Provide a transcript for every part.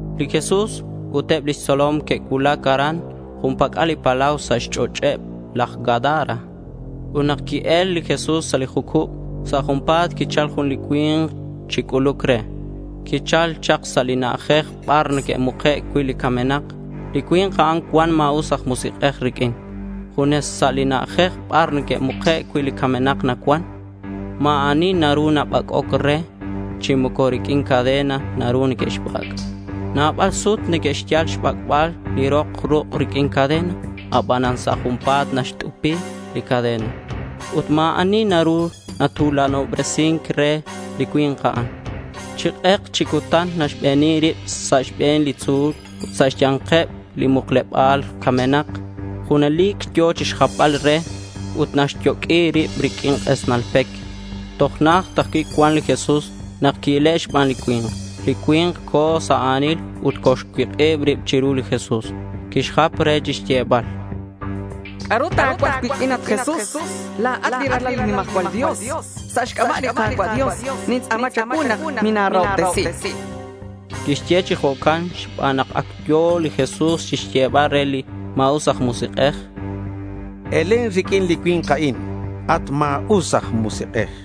Li Jesús ut eb lix tzolom que'cuulac aran jun pac'al li palau sa' xch'och'eb laj Gadara. Ut nak qui-el li Jesús sa' li jucub, sa' junpa̱t quichal jun li cui̱nk chi c'uluc re. Quichal chak sa' li na'ajej bar neque'muke' cui' li camenak. Li cui̱nk a'an cuan ma̱us aj musik'ej riq'uin. Junes sa' li na'ajej bar neque'muke' cui' li camenak nacuan. Ma̱ ani naru nabac'oc re chi moco riq'uin cadena naru neque'xbac'. Nabal sut neque'xyal xbac'bal li rok ruk' riq'uin cadena. Abanan sa' junpa̱t naxt'upi li cadena. Ut ma̱ ani naru natu̱lanobresin re li cui̱nk a'an. Chi k'ek chi cutan naxbeni rib sa' xbe̱neb li tzu̱l ut sa' xya̱nkeb li mukleba̱l camenak. Junelic yo̱ chixjapbal re ut naxyoq'ui rib riq'uin k'esnal pec. Toj najt ajcui' cuan chak li Jesús nak qui-ile' xban li cui̱nk. Li cui̱nk co̱ sa' a̱nil ut coxcuik'ib rib chiru li Jesús. Quixjap re chixyebal: —¿C'a'ru ta̱cuaj cuiq'uin, at Jesús? La̱at Ralalat li nimajcual Dios. Sa' xc'aba' li Ka̱cua' Dios, nintz'a̱ma cha̱cuu nak mina̱rahobtesi, chan re. Quixye chi jo'can xban nak ac yo̱ li Jesús chixyebal re li ma̱us aj musik'ej: —Elen riq'uin li cui̱nk a'in, at ma̱us aj musik'ej.—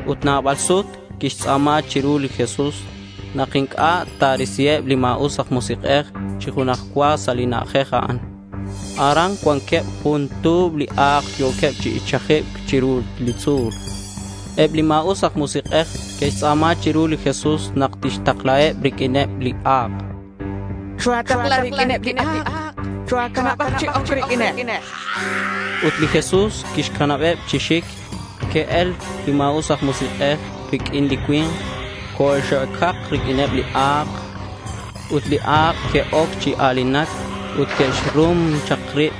Ut nabal sut quixtz'a̱ma chiru li Jesús nak inc'a' ta̱risiheb li ma̱us aj musik'ej chi junaj cua sa' li na'ajej a'an. Aran cuanqueb jun tu̱b li a̱k yo̱queb chi ichajibc chiru li tzu̱l. Eb li ma̱us aj musik'ej que'xtz'a̱ma chiru li Jesús nak tixtaklaheb riq'uineb li a̱k. —Choa̱takla riq'uineb li a̱k. Choa̱canab chi oc riq'uineb, chanqueb. Ut li Jesús quixcanabeb chi xic. Que'el li ma̱us aj musik'ej riq'uin li cui̱nk. Coxe'ocak riq'uineb li a̱k. Ut li a̱k que'oc chi a̱linac ut que'xrum chak rib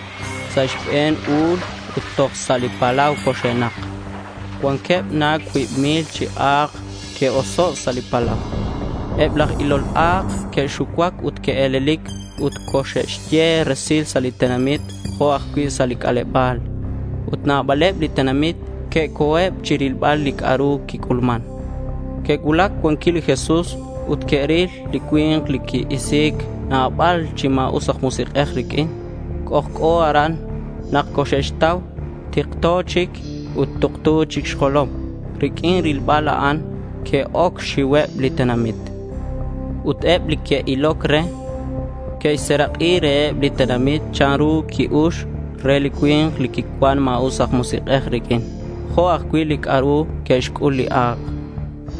sa' xbe̱n u̱l ut toj sa' li palau coxe'nak. Cuanqueb na cuib mil chi a̱k que'oso' sa' li palau. Eb laj ilol a̱k que'xucuac ut que'e̱lelic ut coxe'xye resil sa' li tenamit jo' ajcui' sa' li c'aleba̱l. Ut nabaleb li tenamit que'co̱eb chirilbal li c'a'ru quic'ulman. Que'cuulac cuan cui' li Jesús ut que'ril li cui̱nk li qui-isi̱c nabal chi ma̱us aj musik'ej riq'uin. C'ojc'o aran nak coxe'xtau. Tikto chic ut tuktu chic xjolom. Riq'uin rilbal a'an que'oc xxiuheb li tenamit. Ut eb li que'iloc re, que'xserak'i reheb li tenamit chanru qui-ux re li cui̱nk li quicuan ma̱us aj musik'ej riq'uin, jo' ajcui' li c'a'ru que'xc'ul li a̱k.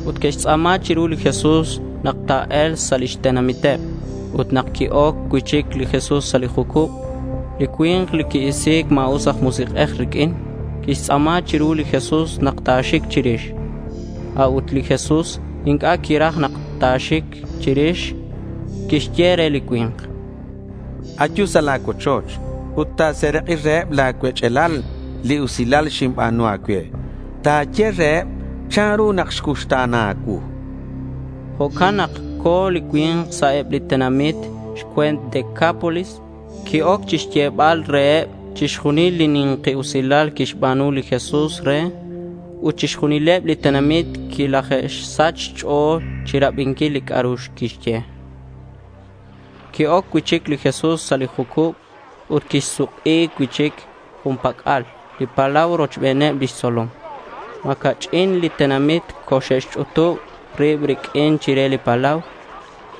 Ut que'xtz'a̱ma chiru li Jesús nak ta̱e̱lk sa' lix tenamiteb. Ut nak qui-oc cui'chic li Jesús sa' li jucub, li cui̱nk li qui-isi̱c ma̱us aj musik'ej riq'uin quixtz'a̱ma chiru li Jesús nak ta̱xic chirix. A'ut li Jesús inc'a' quiraj nak ta̱xic chirix. Quixye re li cui̱nk: —Ayu sa' la̱ cuochoch ut ta̱serak'i reheb la̱ cuech'alal li usilal xinba̱nu a̱cue. Ta̱ye reheb chanru nak xcuuxta̱na a̱cuu, chan re li cui̱nk. Jo'can nak co̱ li cui̱nk sa' eb li tenamit xcue̱nt Decápolis. Qui-oc chixyebal reheb chixjunil li ni̱nki usilal quixba̱nu li Jesús re. Ut chixjunileb li tenamit quilaje'sach xch'o̱l chirabinquil li c'a'ru quixye. Qui-oc cui'chic li Jesús sa' li jucub ut quisuk'i cui'chic jun pac'al li palau rochbeneb lix tzolom. Ma̱ ca'ch'in li tenamit coxe'xch'utub rib riq'uin chire li palau.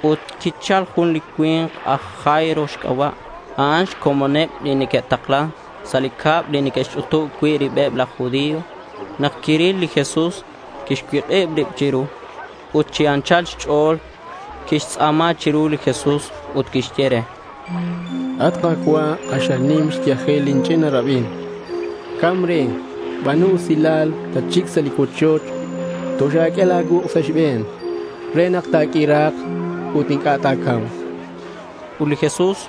Ut quichal jun li cui̱nk aj Jairo xc'aba'. A'an xcomoneb li neque'taklan sa' li cab li neque'xch'utub cui' ribeb laj judío. Nak quiril li Jesús, quixcuik'ib rib chiru. Ut chi anchal xch'o̱l quixtz'a̱ma chiru li Jesús ut quixye re: —At Ka̱cua', k'axal nim xyajel lin ch'ina rabin. Ca̱mc re. Ba̱nu usilal, tatxic sa' cuochoch. Toxa̱q'ue la̱ cuuk' sa' xbe̱n re nak ta̱q'uira̱k ut inc'a' ta̱ca̱mk, chan re li Jesús.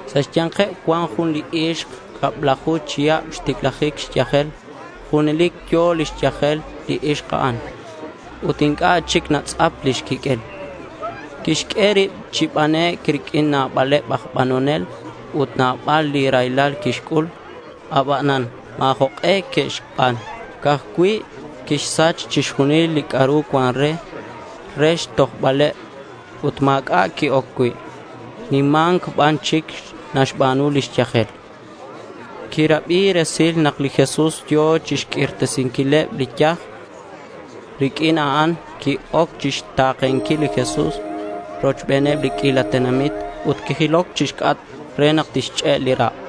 Sa' xya̱nkeb cuan jun li ixk cablaju chihab xticlajic xyajel. Junelic yo̱ lix yajel li ixk a'an ut inc'a' chic natz'ap lix quiq'uel. Quixq'ue rib chi banec' riq'uin nabaleb aj banonel ut nabal li raylal quixc'ul. Abanan ma̱ jok'e que'xban. Ca'aj cui' quixsach chixjunil li c'a'ru cuan re, re xtojbaleb. Ut ma̱c'a' qui-oc cui'. Nima̱nc ban chic naxba̱nu lix yajel. Quirabi resil nak li Jesús yo̱ chixq'uirtesinquileb li yaj. Riq'uin a'an qui-oc chixta̱kenquil li Jesús rochbeneb li q'uila tenamit. Ut quijiloc chixc'atk re nak tixch'e' li rak'.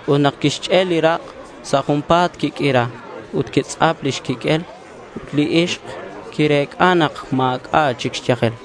Ut nak quixch'e' li rak' sa' junpa̱t quiq'uira, ut quitz'ap lix quiq'uel. Ut li ixk quirec'a nak ma̱c'a' chic xyajel.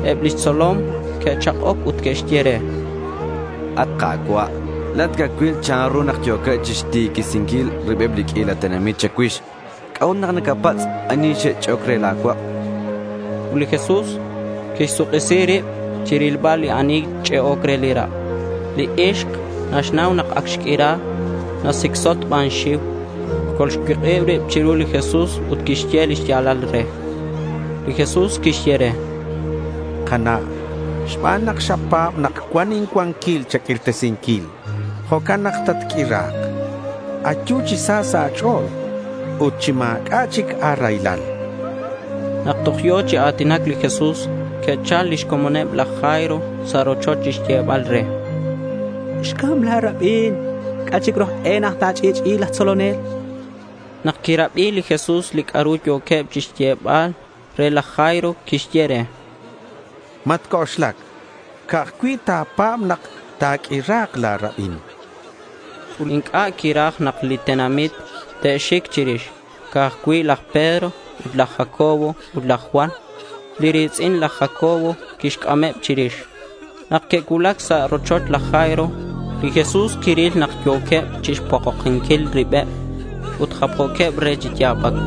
Eb lix tzolom que'chak'oc ut que'xye re: —At Ka̱cua', la̱at nacacuil chanru nak yo̱queb chixtiquisinquil ribeb li q'uila tenamit cha̱cuix. ¿C'a'ut nak nacapatz' ani xch'e'oc re la̱ cuak'? chanqueb. Ut li Jesús quixsuk'isi rib chirilbal ani xch'e'oc re li rak'. Li ixk naxnau nak ac xq'uira. Nasicsot xban xxiu. Colxcuik'ib rib chiru li Jesús ut quixye li xya̱lal re. Li Jesús quixye re: —Kana', xban nak xapa̱b nak cuan incuanquil cha̱q'uirtesinquil, jo'can nak xatq'uira. Ayu chi sa sa' a̱ch'o̱l ut chi ma̱c'a' chic a̱raylal, chan. Nak toj yo̱ chi a̱tinac li Jesús, que'chal lix comoneb laj Jairo sa' rochoch chixyebal re, —Xcam la̱ rabin. ¿C'a' chic ru aj e nak ta̱ch'i'ch'i'i laj tzolonel? chanqueb. Nak quirabi li Jesús li c'a'ru yo̱queb chixyebal re laj Jairo, quixye re: —Matc'oxlac. Ca'aj cui' ta̱pa̱b nak ta̱q'uira̱k la̱ rabin, chan. Ut inc'a' quiraj nak li tenamit te'xic chirix. Ca'aj cui' laj Pedro ut laj Jacobo ut laj Juan, li ri̱tz'in laj Jacobo, quixc'ameb chirix. Nak que'cuulac sa' rochoch laj Jairo, li Jesús quiril nak yo̱queb chixpokokinquil ribeb ut japjo̱queb re chi ya̱bac.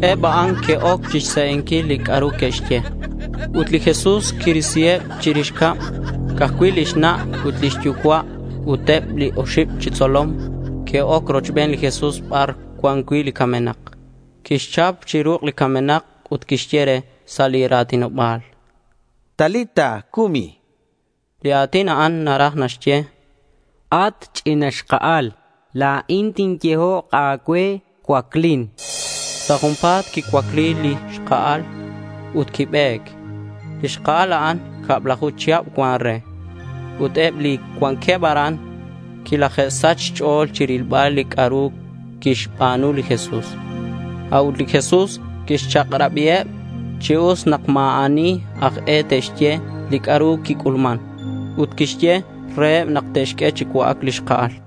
Eb a'an que'oc chixse'enquil li c'a'ru quixye, ut li Jesús quirisiheb chirix cab. Ca'aj cui' lix na' ut lix yucua' ut eb li oxib chi xtzolom que'oc rochben li Jesús bar cuan cui' li camenak. Quixchap chi ruk' li camenak ut quixye re sa' li ra̱tinoba̱l: —Talita, cumi, chan. Li a̱tin a'an naraj naxye, “At ch'ina xka'al, la̱in tinyehok a̱cue cuaclin”. Sa' junpa̱t quicuacli li xka'al ut quibe̱c. Li xka'al a'an cablaju chihab cuan re. Ut eb li cuanqueb aran quilaje'sach xch'o̱l chirilbal li c'a'ru quixba̱nu li Jesús. A'ut li Jesús quixchak'rabiheb chi us nak ma̱ ani aj e te'xye li c'a'ru quic'ulman. Ut quixye reheb nak te'xq'ue chi cua'ac li xka'al.